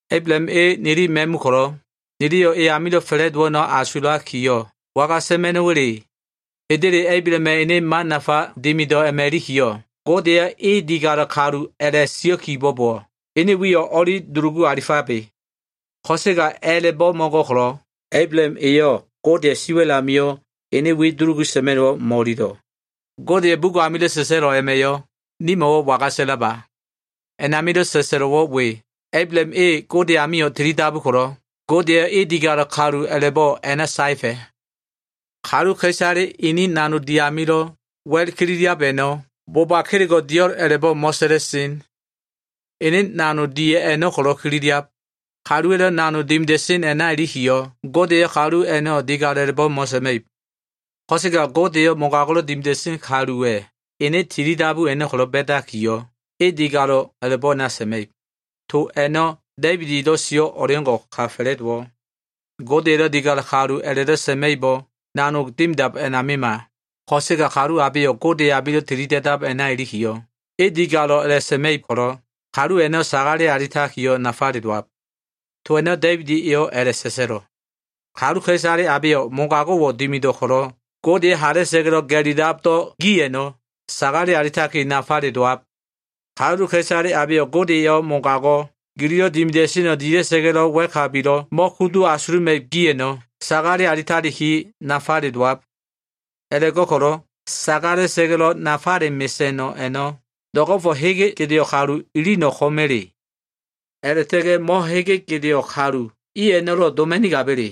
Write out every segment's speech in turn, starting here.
Ablaham e nili ma꞉mu ko꞉lo꞉, niliyo꞉ e amilo꞉ fa꞉la꞉dowo꞉ a꞉no꞉ asulakiyo꞉, waga sa꞉ma꞉no꞉wa꞉le? Hendele, Ablahama꞉ ene man nafale dimido꞉ a꞉ma꞉ ilikiyo꞉, Gode eyo꞉ e digalo꞉ kalu a꞉la꞉sio꞉ kibo꞉bowo꞉, ene wiyo꞉ o꞉li dulugu alifabe. Ko꞉sega a꞉la꞉bo꞉ mo꞉go꞉ ko꞉lo꞉, Ablaham eyo꞉ Godeya꞉ siwa꞉l amio꞉ ene wi dulugu sa꞉ma꞉no꞉wo꞉ mo꞉ililo꞉. Godeya꞉ bugo꞉ amilo꞉ sa꞉sa꞉lo꞉ a꞉ma꞉yo꞉ nimo꞉wo꞉ waga sa꞉laba? A꞉namilo꞉ sa꞉sa꞉lo꞉wo꞉ we, “Ablaham e Gode amio꞉ tilidabu ko꞉lo꞉, Gode eyo꞉ e digalo꞉ kalu a꞉la꞉bo꞉ a꞉na saefa꞉.” Kaluka꞉isale ini nanog di amilo꞉ wa꞉l kililiab a꞉no꞉, boba kelego꞉ dio꞉l a꞉la꞉bo꞉ mo꞉sa꞉la꞉sen. Ene nanog di a꞉no꞉ ko꞉lo꞉ kililiab. Kaluwa꞉lo꞉ nanog dimida꞉sen a꞉na ilikiyo꞉, Gode eyo꞉ kalu a꞉no꞉ digalo꞉ a꞉la꞉bo꞉ mo꞉sa꞉ma꞉ib. Ko꞉sega Gode eyo꞉ mogago꞉lo꞉ dimida꞉sen kaluwa꞉ ene tilidabu a꞉no꞉ ko꞉lo꞉ ba꞉dakiyo꞉, e digalo꞉ a꞉la꞉bo꞉ a꞉na sa꞉ma꞉ib. To a꞉no꞉ Da꞉ibid elo꞉ sio꞉ o꞉leo꞉ngo꞉ka fa꞉la꞉dowo꞉. Gode elo꞉ digalo꞉ kalu a꞉la꞉do꞉ sa꞉ma꞉ibo꞉ nanog dimidab a꞉namima, ko꞉sega kalu abeyo꞉ Gode amilo꞉ tilida꞉dab a꞉na ilikiyo꞉, e digalo꞉ a꞉la꞉sa꞉ma꞉ib ko꞉lo꞉, kalu a꞉no꞉ sagale alitaki nafale dowab. To a꞉no꞉ Da꞉ibid eyo꞉ a꞉la꞉sa꞉sa꞉lo꞉, “Kaluka꞉isale abeyo꞉ mogago꞉wo꞉ dimido꞉ ko꞉lo꞉, Gode eyo꞉ hala꞉sa꞉ga꞉lo꞉ ga꞉lilabdo꞉ gi a꞉no꞉, sagale alitaki nafale dowab. Kaluka꞉isale abeyo꞉ Gode eyo꞉ mogago꞉ gililo꞉ dimida꞉seno꞉ dila꞉sa꞉ga꞉lo꞉ wa꞉kabilo꞉ mo꞉kudu asuluma꞉ib gi a꞉no꞉ sagale alitaliki nafale dowab.” A꞉la꞉go꞉ko꞉lo꞉ sagalesa꞉ga꞉lo꞉ nafale mesa꞉no꞉ a꞉no꞉ do꞉go꞉fo꞉ hege gedeo꞉ kalule ilino꞉ ko꞉ma꞉le? A꞉la꞉ta꞉ga꞉ mo꞉hege gedeo꞉ kalu i a꞉no꞉lo꞉ doma꞉nigaba꞉le?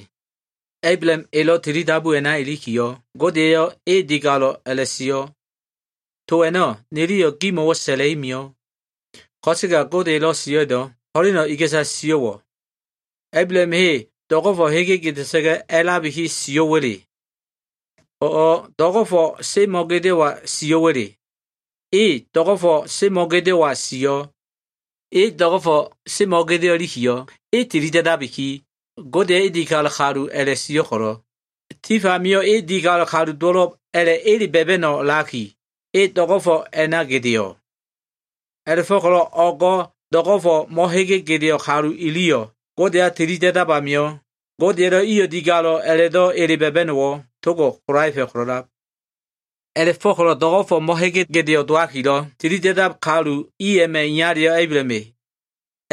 Ablaham elo꞉ tilidabu a꞉na ilikiyo꞉, Gode eyo꞉ e digalo꞉ a꞉la꞉sio꞉. To a꞉no꞉, niliyo꞉ gimo꞉wo꞉ sa꞉la꞉i mio꞉. Ko꞉sega Gode elo꞉ sio꞉ a꞉no꞉, ho꞉leno꞉ iga꞉sa sio꞉wo꞉? Ablaham e do꞉go꞉fo꞉ hege gedea꞉sa꞉ga꞉ a꞉labiki sio꞉wa꞉le? O꞉ do꞉go꞉fo꞉ semo꞉gedeo꞉wa sio꞉wa꞉le? E do꞉go꞉fo꞉ semo꞉ gedeo꞉wa sio꞉. E do꞉go꞉fo꞉ semo꞉ gedeo꞉ ilikiyo꞉, e tilida꞉dabiki, Gode eyo꞉ e digalo꞉ kalu a꞉la꞉sio꞉ ko꞉lo꞉, tif amio꞉ e digalo꞉ kalu dowo꞉lo꞉b a꞉la꞉ ele ba꞉ba꞉no꞉ a꞉lakiyo꞉, e do꞉go꞉fo꞉ a꞉na gedeo꞉. A꞉la꞉fo꞉ko꞉lo꞉ o꞉go꞉ do꞉go꞉fo꞉ mo꞉hege gedeo꞉ kalu iliyo꞉ Godeya tilida꞉dab amio꞉, Godeya꞉lo꞉ iyo꞉ digalo꞉ a꞉la꞉do꞉ ba꞉ba꞉no꞉wo꞉ togo꞉ kolaefa꞉ ko꞉lo꞉lab. A꞉la꞉go꞉ko꞉lo꞉ do꞉go꞉fo꞉ mo꞉hege gedeo꞉ dowakilo꞉ tilida꞉dab kalu i a꞉ma꞉ iyaleyo꞉, Ablaham e.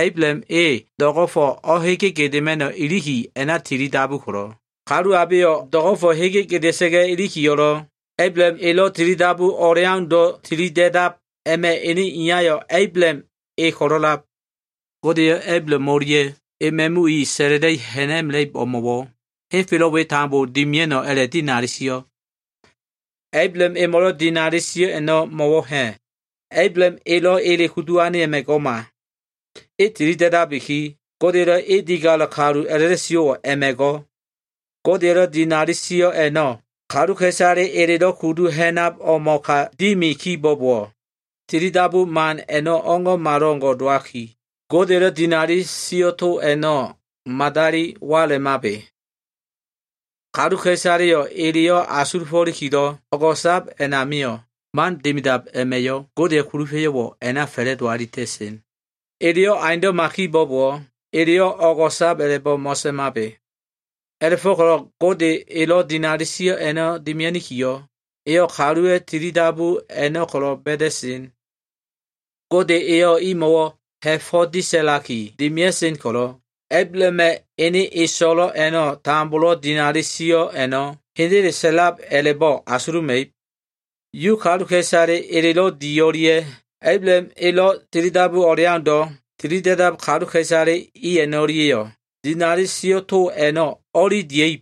Ablaham e do꞉go꞉fo꞉ o꞉hege gedema꞉no꞉ iliki a꞉na tilidabu ko꞉lo꞉, kalu abeyo꞉ do꞉go꞉fo꞉ hege gedea꞉sa꞉ga꞉ ilikiyo꞉lo꞉, Ablaham elo꞉ tilidabu o꞉leaundo꞉ tilida꞉dab a꞉ma꞉ ene iyayo꞉ Ablaham e ko꞉lo꞉lab. Gode eyo꞉ Ablaham o꞉lia꞉ ema꞉mu i sa꞉la꞉la꞉i ha꞉na꞉mela꞉ib o꞉mo꞉wo꞉ henfelo꞉ we tambo dimia꞉no꞉ a꞉la꞉dinali sio꞉. Ablaham emo꞉lo꞉ dinali sio꞉ a꞉no꞉ mo꞉wo꞉ ha꞉? Ablaham elo꞉ ele kudu ane a꞉ma꞉ go꞉ma. E tili da꞉dabiki, Godeya꞉lo꞉ e digalo꞉ kalu a꞉la꞉do꞉ sio꞉wo꞉ a꞉ma꞉ go꞉. Godeya꞉lo꞉ dinali sio꞉ a꞉no꞉ kaluka꞉isale elelo꞉ kudu ha꞉nab o꞉mo꞉ka dimi kibo꞉bowo꞉, tilidabu man a꞉no꞉ o꞉ngo꞉malo꞉ngo꞉ dowaki, Godeya꞉lo꞉ dinali sio꞉ to a꞉no꞉ madali walemabe. Kaluka꞉isaleyo꞉ eleyo꞉ asulufo꞉likilo꞉ o꞉go꞉sa꞉lab a꞉namio꞉, man dimidab a꞉ma꞉yo꞉ Godeya꞉ kulufa꞉yo꞉wo꞉ a꞉na fa꞉la꞉do alita꞉sen. Eleyo꞉ aundo꞉ma kibo꞉bowo꞉, eleyo꞉ o꞉go꞉sab a꞉la꞉bo꞉ mo꞉sa꞉mabe. A꞉la꞉fo꞉ko꞉lo꞉ Gode elo꞉ dinali sio꞉ a꞉no꞉ dimia꞉nikiyo꞉, eyo꞉ kaluwa꞉ tilidabu a꞉no꞉ ko꞉lo꞉ ba꞉da꞉sen. Gode eyo꞉ imo꞉wo꞉ ha꞉fo꞉ disa꞉laki dimia꞉sen ko꞉lo꞉, Ablahama꞉ ene eso꞉lo꞉le a꞉no꞉ tambomo꞉wo꞉ dinali sio꞉ a꞉no꞉ hendele sa꞉lab a꞉la꞉bo꞉ asuluma꞉ib. Yu kaluka꞉isale elelo꞉ di o꞉lia꞉ Ablaham elo꞉ tilidabu o꞉leaundo꞉ tilida꞉dab kaluka꞉isale i a꞉no꞉lia꞉yo꞉ dinali sio꞉ to a꞉no꞉ o꞉li dia꞉ib.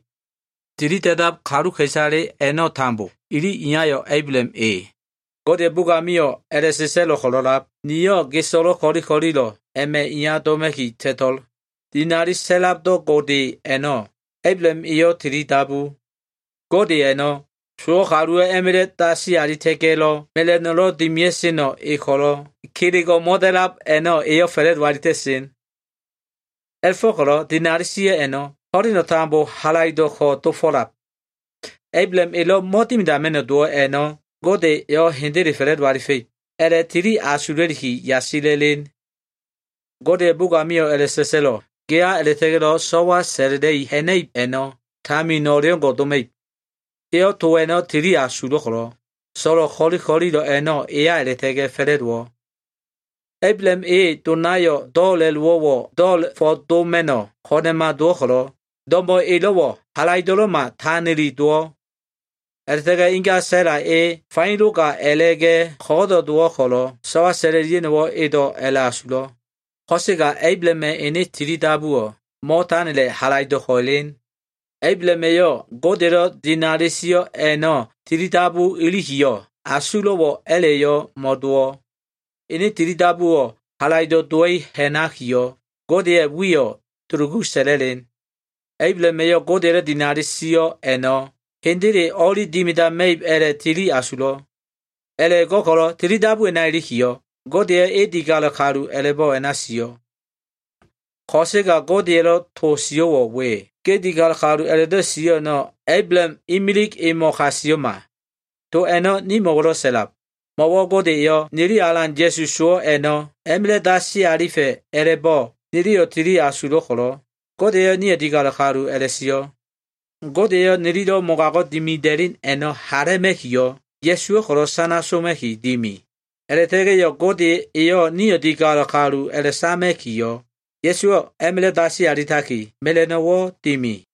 Tilida꞉dab kaluka꞉isale a꞉no꞉ tambo ili iyayo꞉ Ablaham e. Godeya꞉ bugo꞉ amio꞉ a꞉la꞉sa꞉sa꞉lo꞉ ko꞉lo꞉lab, “Niyo꞉ ge so꞉lo꞉ ko꞉li ko꞉lilo꞉ a꞉ma꞉ iya doma꞉ki ta꞉to꞉l.” Dinali sa꞉labdo꞉ Gode a꞉no꞉ Ablaham eyo꞉ tilidabu. Gode a꞉no꞉, sowo꞉ kaluwo꞉ a꞉ma꞉la꞉ dasi alita꞉ga꞉lo꞉ mela꞉no꞉lo꞉ dimia꞉seno꞉ e ko꞉lo꞉, kelego꞉ mo꞉da꞉lab a꞉no꞉ eyo꞉ fa꞉la꞉do alita꞉sen. A꞉la꞉fo꞉ko꞉lo꞉ dinali sio꞉ a꞉no꞉ ho꞉leno꞉ tambo halaido꞉ko꞉ dofo꞉lab. Ablaham elo꞉ mo꞉dimidama꞉no꞉ dowo꞉ a꞉no꞉, Gode eyo꞉ hendele fa꞉la꞉do alifa꞉ib a꞉la꞉tili asula꞉liki yasila꞉len. Godeya꞉ bugo꞉ amio꞉ a꞉la꞉sa꞉sa꞉lo꞉, “Geya a꞉la꞉ta꞉ga꞉lo꞉ so꞉wa sa꞉la꞉la꞉i ha꞉na꞉ib a꞉no꞉ tamin o꞉leo꞉ngo꞉ doma꞉ib.” Eyo꞉ to a꞉no꞉ tili asulo꞉ ko꞉lo꞉, so꞉lo꞉ ko꞉li ko꞉lilo꞉ a꞉no꞉ eya a꞉la꞉ta꞉ga꞉ fa꞉la꞉dowo꞉. Ablaham e donayo꞉ do꞉la꞉lowo꞉wo꞉ do꞉la꞉fo꞉ doma꞉no꞉wo꞉ ko꞉na꞉ma dowo꞉ ko꞉lo꞉, do꞉mo꞉ elo꞉wo꞉ halaido꞉lo꞉ma, tanili dowo꞉. A꞉la꞉ta꞉ga꞉ inga Sa꞉la e faino ga a꞉la꞉ga꞉ ko꞉go꞉do꞉ dowo꞉ ko꞉lo꞉, so꞉wa sa꞉la꞉lia꞉no꞉wo꞉ edo꞉ a꞉la꞉asulo꞉. Ko꞉sega Ablahama꞉ ene tilidabuwo꞉ mo꞉tanila꞉ halaido꞉ko꞉ elen. Ablaham eyo꞉ Godeya꞉lo꞉ dinali sio꞉ a꞉no꞉ tili dabu ilikiyo꞉, asulo꞉wo꞉ a꞉la꞉yo꞉ mo꞉dowo꞉. Ene tilidabuwo꞉ halaido꞉ dowa꞉i ha꞉nakiyo꞉, Godeya꞉ wiyo꞉ dulugu sa꞉la꞉len. Ablaham eyo꞉ Godeya꞉lo꞉ dinali sio꞉ a꞉no꞉ hendele o꞉li dimidama꞉ib a꞉la꞉tili asulo꞉. A꞉la꞉go꞉ko꞉lo꞉ tilidabu a꞉na ilikiyo꞉, Gode eyo꞉ e digalo꞉ kalu a꞉la꞉bo꞉ a꞉na sio꞉. Ko꞉sega Godeya꞉lo꞉ to sio꞉wo꞉ we, “Ge digalo꞉ kalu” a꞉la꞉do꞉ sio꞉ a꞉no꞉ Ablaham imilig emo꞉ ka sio꞉ma. To a꞉no꞉ nimo꞉wo꞉lo꞉ sa꞉lab. Mo꞉wo꞉ Gode eyo꞉ nili Alan Ya꞉su sowo꞉ a꞉no꞉ a꞉ma꞉la꞉ dasi alifa꞉ a꞉la꞉bo꞉ niliyo꞉ tili asulo꞉ ko꞉lo꞉, Gode eyo꞉ nio꞉ digalo꞉ kalu a꞉la꞉sio꞉. Gode eyo꞉ mogago꞉ nililo꞉ dimida꞉len a꞉no꞉ hala꞉ma꞉kiyo꞉, Ya꞉suwo꞉ ko꞉lo꞉ sana soma꞉ki dimi. A꞉la꞉ta꞉ga꞉yo꞉ Gode eyo꞉ nio꞉ digalo꞉ kalu a꞉la꞉sama꞉kiyo꞉, Ya꞉suwo꞉ a꞉ma꞉la꞉ dasi alitaki, mela꞉no꞉wo꞉ dimi.